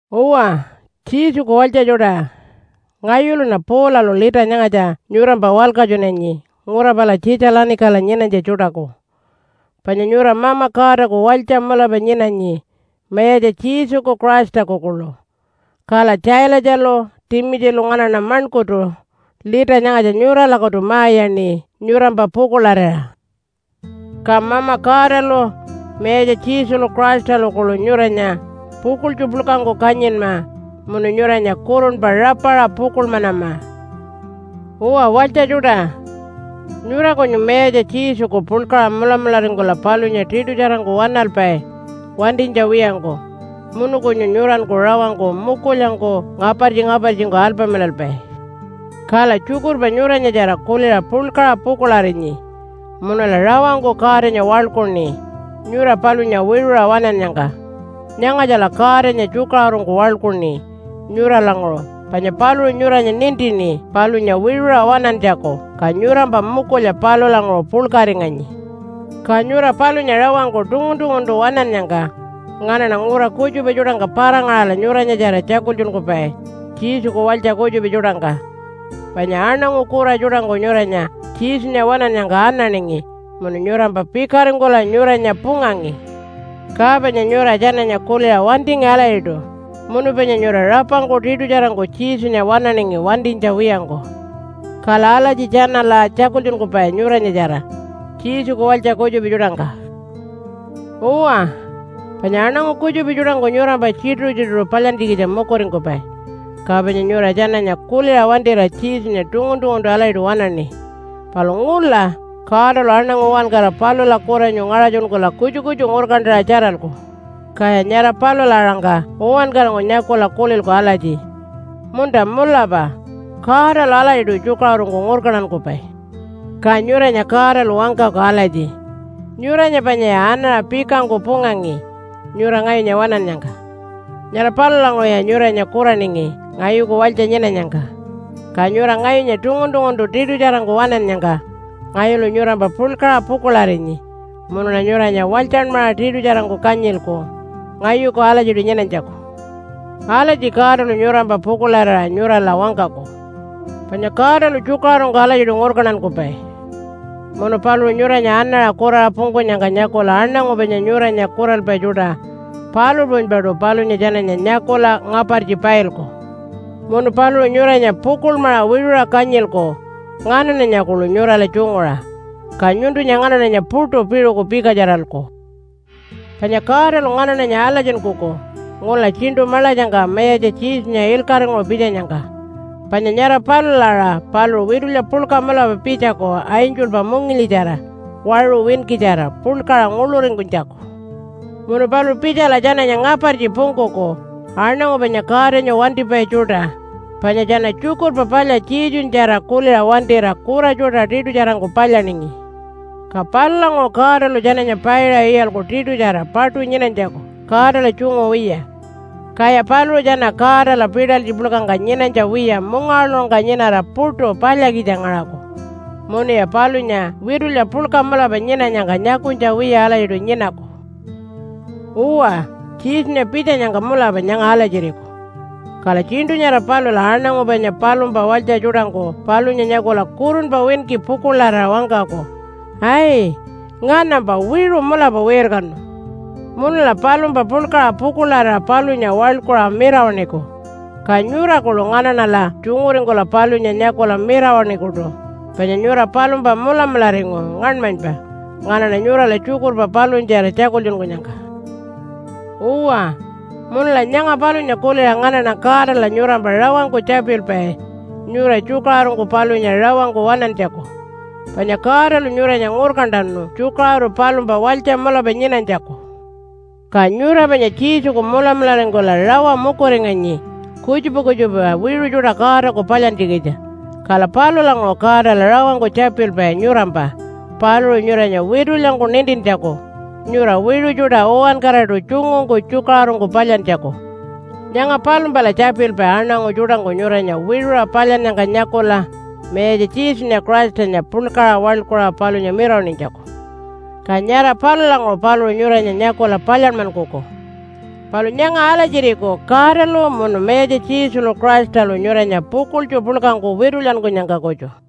Uwa, Jesuku walytja tjuṯa, ngayuluṉa Paulalu lita nyangatja nyurampa walkatjunanyi ngura pala Tjitja-lanikala nyinanytja tjuṯaku. Panya nyura Mama Godaku walytja mulapa nyinanyi Mayatja Jesuku Christaku kuḻu. Kala Tjaalatjalu Timitjilu nganaṉa maṉkurtu lita nyangatja nyuralakutu ma-iyaṉi nyurampa pukuḻarira. Ka Mama Godalu Mayatja Jesulu Christalu kuḻu nyuranya pukuḻtju puḻkangku kanyinma munu nyuranya kurunpa rapaṟa pukuḻmanama. Uwa walytja tjuṯa, nyura kunyu Mayatja Jesuku puḻkaṟa mulamularingkula palunya tiṯutjarangku waṉalpai wantinytja wiyangku, munu kunyu nyuranku rawangku mukulyangku ngapartji-ngapartjingku alpamilalpai. Kala tjukurpa nyuranyatjara kuliṟa puḻkaṟa pukuḻarinyi munula rawangku Godanya waḻkuṉi nyura palunya wiṟuṟa waṉannyangka. Nyangatjala Godanya tjukaṟurungku waḻkuṉi nyuralanguṟu panya paluṟu nyuranya nintini palunya wiṟuṟa waṉantjaku ka nyurampa mukulya palulanguṟu puḻkaringanyi. Ka nyura palunya rawangku tungun-tunguntu waṉannyangka nganaṉa ngura kutjupa tjuṯangka para-ngaṟala nyuranyatjara tjakultjunkupai Jesuku walytja kutjupa tjuṯangka. Panya aṉangu kura tjuṯangku nyuranya Jesunya waṉannyangka ananingi munu nyurampa pikaringkula nyuranya pungangi. Ka panya nyura tjananya kuliṟa wantingi alatjiṯu munu panya nyura rapangku tiṯutjarangku Jesunya waṉaningi wantinytja wiyangku. Kala alatji tjanala tjakultjunkupai nyuranyatjara Jesuku walytja kutjupa tjuṯangka. Uwa, panya aṉangu kutjupa tjuṯangku nyurampa tjituṟu-tjituṟu palyantjikitja mukuringkupai, ka panya nyura tjananya kuliṟa wantira Jesunya tungun-tunguntu alatjiṯu waṉaṉi. Palu ngula Godalu aṉangu uwankara palula kuranyu ngaṟatjunkula kutju kutju ngurkantaṟa tjaralku, kaya nyara palula aṟangka uwankarangku nyakula kulilku alatji, “Munta mulapa Godalu alatjiṯu tjukaṟurungku ngurkantankupai.” Ka nyuranya Godalu wangkaku alatji, “Nyuranya panyaya anaṟa pikangku pungangi nyura ngayunya waṉannyangka. Nyara palulanguṟuya nyuranya kuraningi ngayuku walytja nyinanyangka. Ka nyura ngayunya tungun-tunguntu tiṯutjarangku waṉannyangka ngayulu nyurampa puḻkaṟa pukuḻarinyi munuṉa nyuranya walytjanmaṟa tiṯutjarangku kanyilku ngayuku alatjiṯu nyinanytjaku.” Alatji Godalu nyurampa pukuḻarira nyurala wangkaku. Panya Godalu tjukaṟurungku alatjiṯu ngurkantankupai. Munu paluṟu nyuranya anaṟa kuraṟa pungkunyangka nyakula aṉangu panya nyuranya kuralpai tjuṯa palu puṟunypaṯu palunya tjananya nyakula ngapartji pailku. Munu paluṟu nyuranya pukuḻmaṟa wiṟuṟa kanyilku nganaṉanya kuḻu nyurala tjunguṟa, ka nyuntunya nganaṉanya puṯu piṟuku pikatjaralku. Panya Godalu nganaṉanya alatjinkuku ngula tjiṉṯu maḻatjangka Mayatja Jesunya ilkaṟinguṟu pitjanyangka. Panya nyara palula aṟa paluṟu witulya puḻka mulapa pitjaku angelpa mungilyitjara waṟu winkitjara puḻkaṟa nguḻuringkunytjaku. Munu paluṟu pitjala tjananya ngapartji pungkuku aṉangu panya Godanya wantipai tjuṯa, panya tjana Tjukurpa Palya Jesunyatjara kuliṟa wantira kura tjuṯa tiṯutjarangku palyaningi. Ka palulanguṟu Godalu tjananya paiṟa iyalku tiṯutjara paṯu nyinanytjaku Godala tjungu wiya. Kaya paluṟu tjana Godala pitalytji puḻkangka nyinanytja wiya mungawaḻuṟungka nyinara puṯu palyakitja ngaṟaku, munuya palunya witulya puḻka mulapa nyinanyangka nyakunytja wiya alatjiṯu nyinaku. Uwa, Jesunya pitjanyangka mulapa nyanga alatjiriku. Kala tjiṉṯu nyara palula aṉangu panya palumpa walytja tjuṯangku palunya nyakula kurunpa winki pukuḻarira wangkaku, “Ai, nganampa wiṟu mulapa wirkanu.” Munula palumpa puḻkaṟa pukuḻarira palunya waḻkuṟa mirawaṉiku. Ka nyura kuḻu nganaṉala tjunguringkula palunya nyakula mirawaṉikuṯu, panya nyura palumpa mulamularingu ngaṉmanypa nganaṉa nyurala tjukurpa palunyatjara tjakultjunkunyangka. Uwa, munula nyanga palunya kuliṟa nganaṉa Godala nyurampa rawangku tjapilpai nyura tjukaṟurungku palunya rawangku waṉantjaku. Panya Godalu nyuranya ngurkantanu tjukaṟuru palumpa walytja mulapa nyinanytjaku. Ka nyura panya Jesuku mulamularingkula rawa mukuringanyi kutjupa kutjupa wiṟu tjuṯa Godaku palyantjikitja, kala palulanguṟu Godala rawangku tjapilpai nyurampa paluṟu nyuranya witulyangku nintintjaku nyura wiṟu tjuṯa uwankaraṯu tjungungku tjukaṟurungku palyantjaku. Nyanga palumpala tjapilpai aṉangu tjuṯangku nyuranya wiṟuṟa palyannyangka nyakula Mayatja Jesunya Christanya puḻkaṟa waḻkuṟa palunya mirawaṉinytjaku, ka nyara palulanguṟu paluṟu nyuranya nyakula palyanmankuku. Palu nyanga alatjiriku Godalu munu Mayatja Jesulu Christalu nyuranya pukuḻtju puḻkangku witulyankunyangka kutju.